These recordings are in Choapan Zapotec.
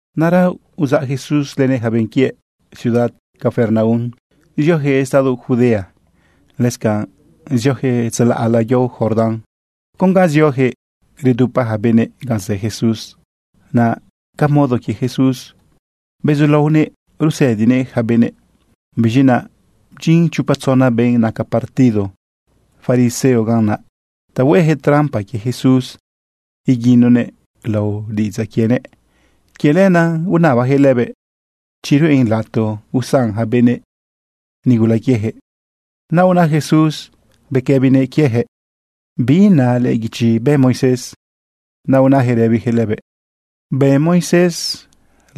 Naꞌra uzaꞌ Jesús lënëꞌ yaca benꞌ quiëꞌ ciudad Capernaum zioyaquëꞌ estado Judea, lëscanꞌ zioyaquëꞌ tzalaꞌla yao Jordán. Con ga zioyaquëꞌ redupa yaca benëꞌ ganꞌ zë Jesús. Naꞌ ca modo quie Jesús, bezulaonëꞌ rusëdinëꞌ yaca benëꞌ. Biz̃i naꞌ bdyin chopa tzona benꞌ naca partido fariseo ganꞌ naꞌ ta hueyaquëꞌ trampa quie Jesús iguinonëꞌ lao diꞌidzaꞌ quienëꞌ. Quie lenaꞌ unabayaquëꞌ lëbëꞌ chi ruꞌen lato usan yaca benëꞌ nigula quieyaquëꞌ. Naꞌ una Jesús bequëbinëꞌ leyaquëꞌ: ―¿Bi na lëꞌë guichi bë Moisés? Naꞌ unayaquëꞌ rëbiyaquëꞌ lëbëꞌ: ―Bëꞌ Moisés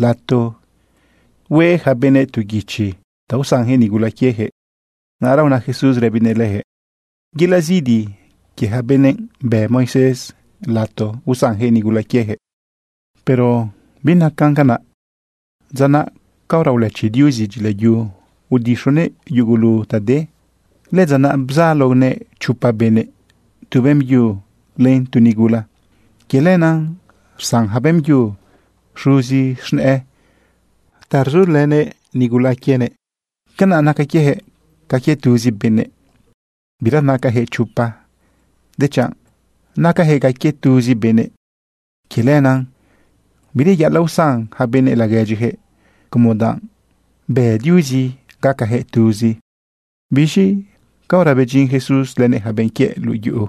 lato hue yaca benëꞌ tu guichi ta usanyaquëꞌ nigula quieyaquëꞌ. Naꞌra una Jesús rëbinëꞌ leyaquëꞌ: ―Yelaꞌ zidi quie yaca benëꞌ bëꞌ Moisés lato usanyaquëꞌ nigula quieyaquëꞌ. Pero binacan canaꞌ dza naꞌ caora ulëchi Diuzi dyilayu udixonëꞌ yugulu ta de. “Lëdza naꞌ bzaloguëꞌ chopa benëꞌ, tu beꞌmbyu len tu nigula.” Quie lenaꞌ rsan yaca beꞌmbyu xuzi z̃nëꞌë ta rzulënëꞌ nigula quienëꞌ. Canaꞌ naca quieyaquëꞌ ca quie tuzi benëꞌ. Bira nacayaquëꞌ chopa, dechanꞌ nacayaquëꞌ ca quie tuzi benëꞌ. Quie lenaꞌ bireyaꞌalaꞌ usan yaca benëꞌ laguedyiyaquëꞌ como danꞌ bë Diuzi gacayaquëꞌ tuzi. Biz̃i caora bedyin Jesús lënëꞌ yaca benꞌ quiëꞌ luꞌu yuꞌu,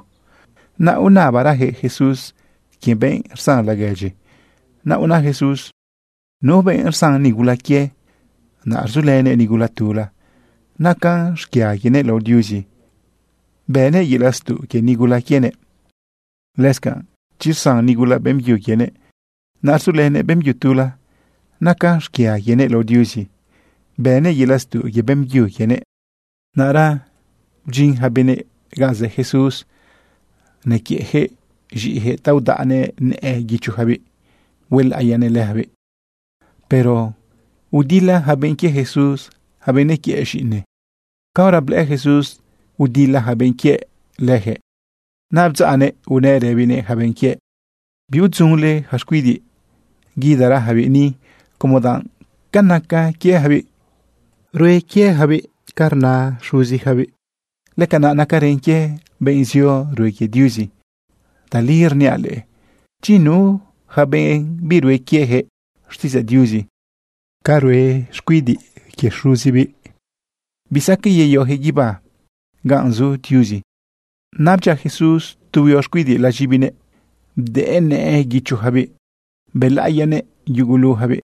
naꞌ unabarayaquëꞌ Jesús quie benꞌ rsan laguedyi. Naꞌ una Jesús: ―Nu benꞌ rsan nigula quie, naꞌ rzulënëꞌ nigula tula, nacan xquia quienëꞌ lao Diuzi, bënëꞌ yelaꞌ stuꞌ quie nigula quienëꞌ. Lëscanꞌ chi rsan nigula beꞌmbyu quienëꞌ, naꞌ rzulënëꞌ beꞌmbyu tula, nacan xquia quienëꞌ lao Diuzi, bënëꞌ yelaꞌ stuꞌ quie beꞌmbyu quienëꞌ. Naꞌra bdyin yaca benëꞌ ganꞌ zë Jesús nequiëꞌyaquëꞌ z̃iꞌiyaquëꞌ ta udaꞌnëꞌ nëꞌë guichoyacabiꞌ huelaꞌiyanëꞌ leyacabiꞌ. Pero udila yaca benꞌ quie Jesús yaca benꞌ nequiëꞌ z̃iꞌine. Caora blëꞌë Jesús udila yaca benꞌ quiëꞌ leyaquëꞌ, naꞌ bdzaꞌnëꞌ unëꞌ rëbinëꞌ yaca benꞌ quiëꞌ: ―Biudzunle yaca xcuidiꞌ. Guidagarayacabiꞌ ni como danꞌ ca naca quieyacabiꞌ, rue quieyacabiꞌ ca rna xuziyacabiꞌ, lëcanaꞌ nacarën quie benꞌ zio rue quie Diuzi. Tali rniaꞌ leꞌe, chi nu yaca benꞌ birue quieyaquëꞌ xtiꞌidzaꞌ Diuzi ca rue xcuidiꞌ quie xuzibiꞌ, bisaqueꞌ yeyoyaquëꞌ guibá ganꞌ zu Diuzi. Naꞌ bdyia Jesús tu huio xcuidiꞌ laz̃ibinëꞌ bdëꞌë nëꞌë guichoyacabiꞌ bëlaꞌiyanëꞌ yuguluyacabiꞌ.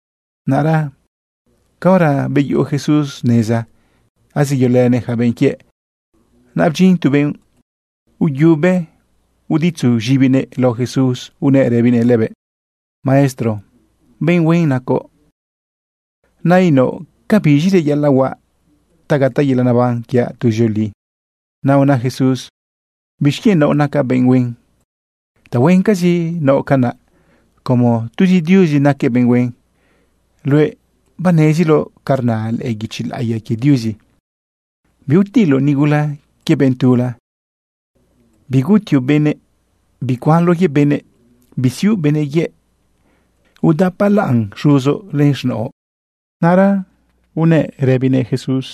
Naꞌra caora beyuꞌu Jesús neza azeyolënëꞌ yaca benꞌ quiëꞌ, naꞌ bdyin tu benꞌ uyuꞌu be, uditzu z̃ibinëꞌ lao Jesús unëꞌ rëbinëꞌ lëbëꞌ: ―Maestro, benꞌ huen nacoꞌ. Nainaoꞌ, ¿ca biz̃i reyaꞌalaꞌ huaꞌ ta gataꞌ yelaꞌ neban quiaꞌ tuzioli? Naꞌ una Jesús: ―¿Bixquienꞌ naoꞌ nacaꞌ benꞌ huen? Tahuencazi naoꞌ canaꞌ, como tuzi Diuzi naquëꞌ benꞌ huen. Luëꞌ baneziloꞌ ca rna lëꞌë guichi laꞌiya quie Diuzi: “Biutiloꞌ nigula quie benꞌ tula. Bigutioꞌ benëꞌ. Bicuanloꞌ quie benëꞌ. Bisiuꞌ benëꞌ yëꞌ. Udapalaꞌn xuzoꞌ len z̃naoꞌ.” Naꞌra unë benꞌ naꞌ rëbinëꞌ Jesús: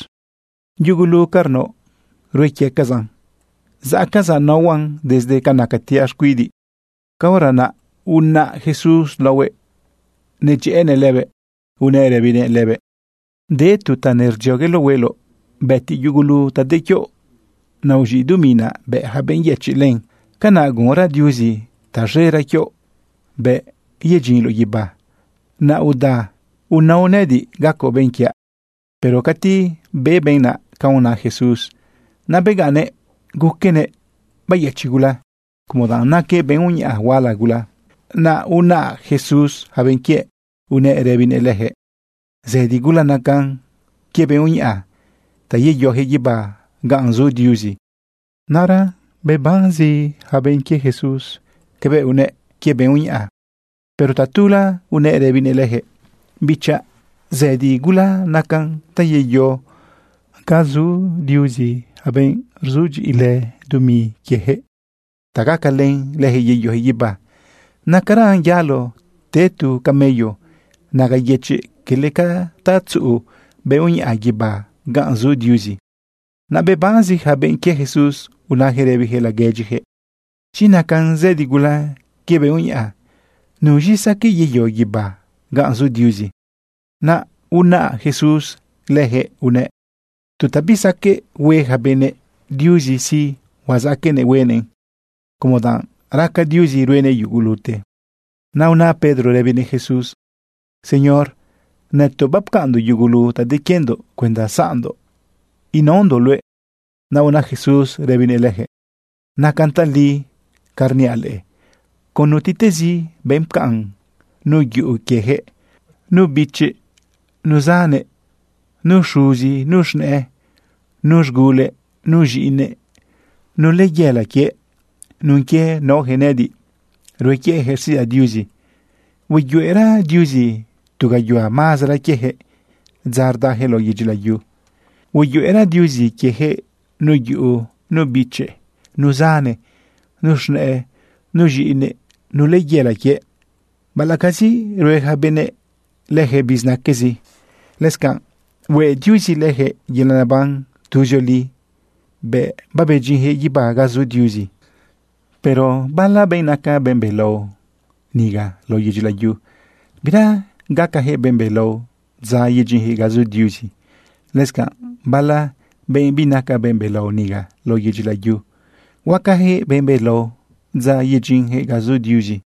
―Yugulu ca rnaoꞌ, rue quiecazaꞌn zaꞌcazaꞌ naohuaꞌn desde nacatiaꞌ xcuidiꞌ. Caora naꞌ unaꞌ Jesús laohuëꞌ nedyëꞌënëꞌ lëbëꞌ, unëꞌ rëbinëꞌ lëbëꞌ: ―De tu ta nerdziogueloꞌ hueloꞌ. Bëtiꞌ yugulu ta de quioꞌ, naꞌ uz̃iꞌ dumi naꞌ, bëꞌ yaca benꞌ yëchiꞌ len. Canaꞌ gunra Diuzi taz̃era quioꞌ bëꞌ yedyinloꞌ guibá. Naꞌ uda unao nëꞌëdiꞌ gacoꞌ benꞌ quiaꞌ. Pero cati be benꞌ naꞌ canꞌ una Jesús, naꞌ begaꞌnnëꞌ guquenëꞌ beyëchiꞌ gula, como danꞌ naquëꞌ benꞌ uñaꞌa huala gula. Naꞌ unaꞌ Jesús yaca benꞌ quiëꞌ unëꞌ rëbinëꞌ leyaquëꞌ: ―Zëdi gula nacan quie benꞌ uñaꞌa ta yeyoyaquëꞌ guibá ganꞌ zu Diuzi. Naꞌra bebanzi yaca benꞌ quie Jesús cabëꞌ unëꞌ quie benꞌ uñaꞌa. Pero tatula unëꞌ rëbinëꞌ leyaquëꞌ: ―Bichaꞌ, zëdi gula nacan ta yeyo ga zu Diuzi yaca benꞌ rzudyiꞌilë dumi quieyaquëꞌ ta gacalën leyaquëꞌ yeyoyaquëꞌ guibá. Nacaran yalo te tu camello naga yëchiꞌ, quele ca ta tzuꞌu benꞌ uñaꞌa guibá ganꞌ zu Diuzi. Naꞌ bebanzi yaca benꞌ quie Jesús unayaquëꞌ rëbiyaquëꞌ laguedyiyaquëꞌ: ―Chi nacan zëdi gula quie benꞌ uñaꞌa, ¿nuz̃i saqueꞌ yeyo guibá ganꞌ zu Diuzi? Naꞌ unaꞌ Jesús leyaquëꞌ unëꞌ: ―Tu ta bisaqueꞌ hue yaca benëꞌ, Diuzi sí, huazaqueꞌnëꞌ huenëꞌn, como danꞌ raca Diuzi ruenëꞌ yugulute. Naꞌ una Pedro rëbinëꞌ Jesús: ―Señor, nëtoꞌ bapcaꞌnndoꞌ yugulu ta de quiendoꞌ cuenda zaꞌndoꞌ naondoꞌ luëꞌ. Naꞌ una Jesús rëbinëꞌ leyaquëꞌ: ―Nacan tali canꞌ rniaꞌ leꞌe. Con nutiꞌtezi benꞌ pcaꞌn nu yuꞌu quieyaquëꞌ, nu bichi, nu zane, nu xuzi, nu z̃nëꞌë, nu z̃gule, nu z̃iꞌine, nu layela quie, nun quie naoyaquëꞌ nëꞌëdiꞌ rue quieyaquëꞌ xtiꞌidzaꞌ Diuzi, hueyuꞌera Diuzi tu gayuhua mazara quieyaquëꞌ dza rdayaquëꞌ lao yedyi layu. Hueyuꞌera Diuzi quieyaquëꞌ nu yuꞌu, nu bichi, nu zane, nu z̃nëꞌë, nu z̃iꞌine, nu layela quie, baꞌalaꞌcazi rue yaca benëꞌ lëyaquëꞌ bizinaquezi. Lëscanꞌ hueꞌ Diuzi lëyaquëꞌ yelaꞌ neban tuzioli bëꞌ bayedyinyaquëꞌ guibá ganꞌ zu Diuzi. Pero bala benꞌ naca benꞌ belao niga lao yedyi layu, bira gacayaquëꞌ benꞌ belao dza yedyinyaquëꞌ ga zu Diuzi. Lëscanꞌ bala benꞌ binaca benꞌ belao niga lao yedyi layu, huacayaquëꞌ benꞌ belao dza yedyinyaquëꞌ ga zu Diuzi.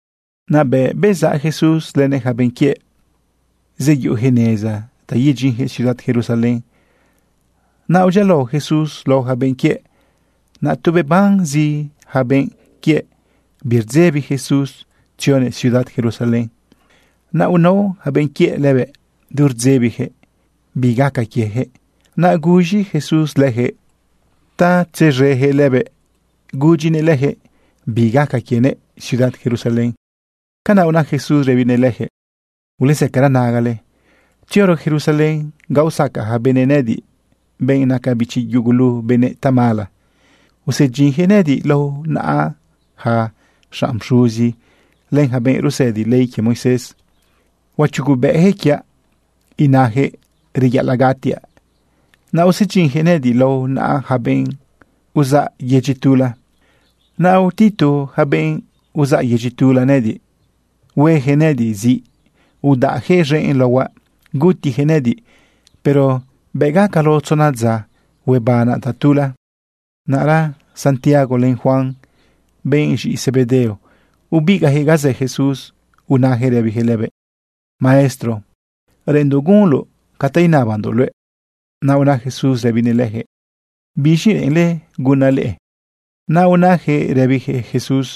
Naꞌ bëꞌ bezaꞌ Jesús lënëꞌ yaca benꞌ quiëꞌ, zeyuꞌuyaquëꞌ neza ta yedyinyaquëꞌ ciudad Jerusalén. Naꞌ udyialao Jesús lao yaca benꞌ quiëꞌ. Naꞌ tu bebanzi yaca benꞌ quiëꞌ birdzebi Jesús tzionëꞌ ciudad Jerusalén. Naꞌ unao yaca benꞌ quienëꞌ lëbëꞌ du rdzebiyaquëꞌ bi gaca quieyaquëꞌ. Naꞌ guz̃i Jesús leyaquëꞌ ta tzez̃eyaquëꞌ lëbëꞌ gudyinëꞌ leyaquëꞌ bi gaca quienëꞌ ciudad Jerusalén. Canaꞌ una Jesús rëbinëꞌ leyaquëꞌ: ―Ulezëcara nagale. Tzioro Jerusalén ga usacaꞌ yaca benëꞌ nëꞌëdiꞌ, benꞌ naca bichi yugulu benëꞌ, tamala. Usedyinyaquëꞌ nëꞌëdiꞌ lao naꞌa yaca xanꞌ pxuzi len yaca benꞌ rusëdi ley quie Moisés. Huachugubëꞌyaquëꞌ quiaꞌ inayaquëꞌ reyaꞌalaꞌ gatiaꞌ. Naꞌ usedyinyaquëꞌ nëꞌëdiꞌ lao naꞌa yaca benꞌ uzaꞌ yedyi tula. Naꞌ utitu yaca benꞌ uzaꞌ yedyi tula nëꞌëdiꞌ. Hueyaquëꞌ nëꞌëdiꞌ ziꞌ, udaꞌyaquëꞌ z̃enꞌ laohuaꞌ, gutiyaquëꞌ nëꞌëdiꞌ. Pero bëꞌ gaca lao tzona dza, huebanaꞌ tatula. Naꞌra Santiago len Juan, benꞌ z̃iꞌi Zebedeo, ubigaꞌyaquëꞌ ga zë Jesús unayaquëꞌ rëbiyaquëꞌ lëbëꞌ: ―Maestro, reꞌenndoꞌ gunloꞌ ca ta inabandoꞌ luëꞌ. Naꞌ una Jesús rëbinëꞌ leyaquëꞌ: ―¿Biz̃i reꞌenle gunaꞌ leꞌe? Naꞌ unayaquëꞌ rëbiyaquëꞌ Jesús: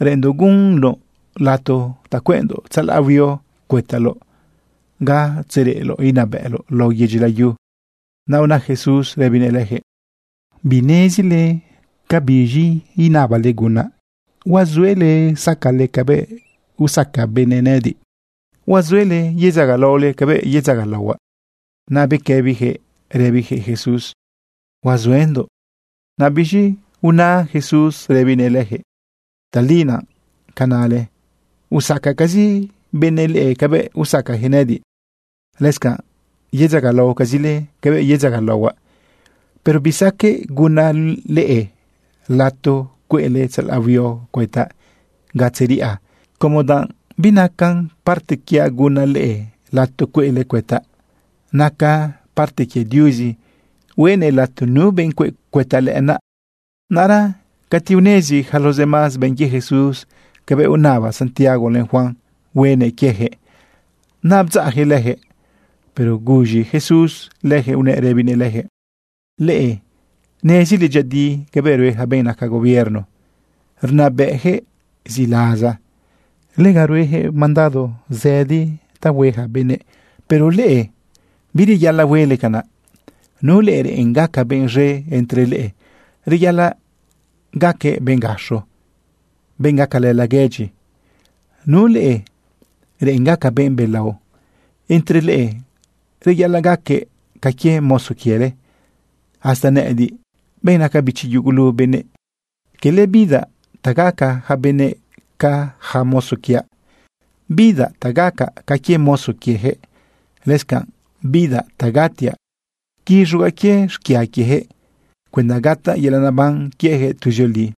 ―Reꞌenndoꞌ gunoꞌ lato ta cueꞌndoꞌ tzalaꞌ huio cuëtalaoꞌ ga tzereꞌloꞌ inabëꞌloꞌ lao yedyi layu. Naꞌ una Jesús rëbinëꞌ leyaquëꞌ: ―Binezile cabiz̃i inabale gunaꞌ. ¿Huazuele sacale cabëꞌ usaca benëꞌ nëꞌëdiꞌ? ¿Huazuele yedzagalaole cabëꞌ yedzagalaohuaꞌ? Naꞌ bequëbiyaquëꞌ rëbiyaquëꞌ Jesús: ―Huazuendoꞌ. Naꞌ biz̃i una Jesús rëbinëꞌ leyaquëꞌ: ―Tali naꞌ ca nale. Usacacazi benëꞌ leꞌe cabëꞌ usacayaquëꞌ nëꞌëdiꞌ, lëscanꞌ yedzagalaocazile cabëꞌ yedzagalaohuaꞌ. Pero bisaqueꞌ gunaꞌ leꞌe lato cueꞌle tzalaꞌ huio cuëtaꞌ ga tzeriꞌa como danꞌ binaca parte quiaꞌ gunaꞌ leꞌe lato cueꞌle cuëtaꞌ. Naca parte quie Diuzi hueꞌnëꞌ lato nu benꞌ cueꞌ cuëtaꞌ lëꞌënaꞌ. Naꞌra cati unezi yaca los demás benꞌ quie Jesús cabëꞌ unaba Santiago len Juan hueꞌnëꞌ quieyaquëꞌ, naꞌ bdzaꞌyaquëꞌ leyaquëꞌ. Pero guz̃i Jesús leyaquëꞌ unëꞌ rëbinëꞌ leyaquëꞌ: ―Leꞌe nezile dyëꞌëdi cabëꞌ rue yaca benꞌ naca gobierno, rnabëꞌyaquëꞌ ziꞌlaza. Lega rueyaquëꞌ mandado zëdi ta rue yaca benëꞌ. Pero leꞌe bireyaꞌalaꞌ huele canaꞌ. Nu leꞌe reꞌen gaca benꞌ z̃e entre leꞌe, reyaꞌalaꞌ gaquëꞌ benꞌ gaxo, benꞌ gacalë laguedyi. Nu leꞌe reꞌen gaca benꞌ belao entre leꞌe, reyaꞌalaꞌ gaquëꞌ ca quie mozo quiele. Hasta nëꞌëdiꞌ, benꞌ naca bichi yugulu benëꞌ, quele bidaꞌ ta gaca yaca benëꞌ ca yaca mozo quiaꞌ, bidaꞌ ta gacaꞌ ca quie mozo quieyaquëꞌ. Lëscanꞌ bidaꞌ ta gatiaꞌ quiz̃ugaꞌ quie xquia quieyaquëꞌ cuenda gataꞌ yelaꞌ neban quieyaquëꞌ tuzioli.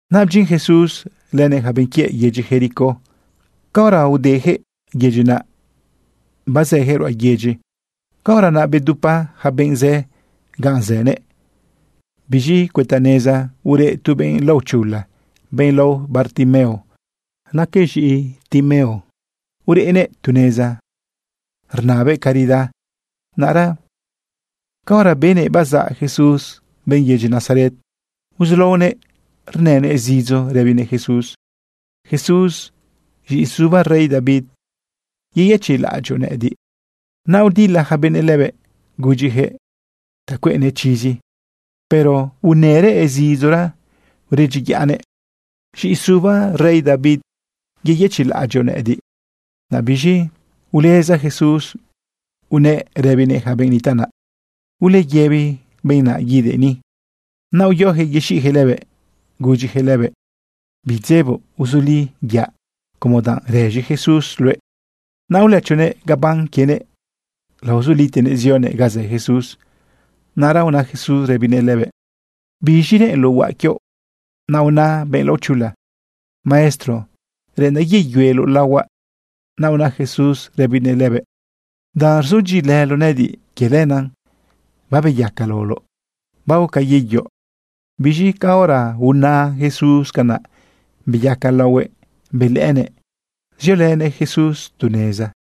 Naꞌ bdyin Jesús lënëꞌ yaca benꞌ quiëꞌ yedyi Jericó. Caora udeyaquëꞌ yedyi, naꞌ bazëyaquëꞌ ruꞌa yedyi, caora naꞌ bdupa yaca benꞌ zë ganꞌ zënëꞌ. Biz̃i cuëta neza ureꞌ tu benꞌ laochula, benꞌ lao Bartimeo. Naquëꞌ z̃iꞌi Timeo, ureꞌnëꞌ tu neza rnabëꞌ caridad. Naꞌra caora benëꞌ bazaꞌ Jesús, benꞌ yedyi Nazaret, uzulaonëꞌ rnënëꞌ zidzo rëbinëꞌ Jesús: ―¡Jesús, z̃iꞌi suba rey David, yeyëchiꞌlaꞌadyoꞌ nëꞌediꞌ! Naꞌ udila yaca benëꞌ lëbëꞌ gudyiyaquëꞌ ta cueꞌnëꞌ chizi, pero unërëꞌ zidzora uredyiyaꞌnëꞌ: ―Z̃iꞌi suba rey David, yeyëchiꞌlaꞌadyoꞌ nëꞌëdiꞌ. Naꞌ biz̃i uleza Jesús unëꞌ rëbinëꞌ yaca benꞌ nitaꞌ naꞌ: ―Uleyëbi benꞌ naꞌ guidëꞌ ni. Naꞌ uyoyaquëꞌ yexiꞌyaquëꞌ lëbëꞌ gudyiyaquëꞌ lëbëꞌ: ―Bidzeboꞌ, uzuli, yaꞌ, como danꞌ rëz̃i Jesús luëꞌ. Naꞌ ulëchonëꞌ gabán quienëꞌ, laozulitenëꞌ zionëꞌ ga zë Jesús. Naꞌra una Jesús rëbinëꞌ lëbëꞌ: ―¿Biz̃i reꞌenloꞌ huaꞌ quioꞌ? Naꞌ una benꞌ laochula: ―Maestro, reꞌendaꞌ yeyueloꞌ laohuaꞌ. Naꞌ una Jesús rëbinëꞌ lëbëꞌ: ―Danꞌ rzudyiꞌilëloꞌ nëꞌëdiꞌ, quie lenaꞌ babeyaca laoloꞌ. Baoca, yeyo. Biz̃i caora una Jesús canaꞌ, beyaca laohuëꞌ belëꞌënëꞌ, ziolënëꞌ Jesús tu neza.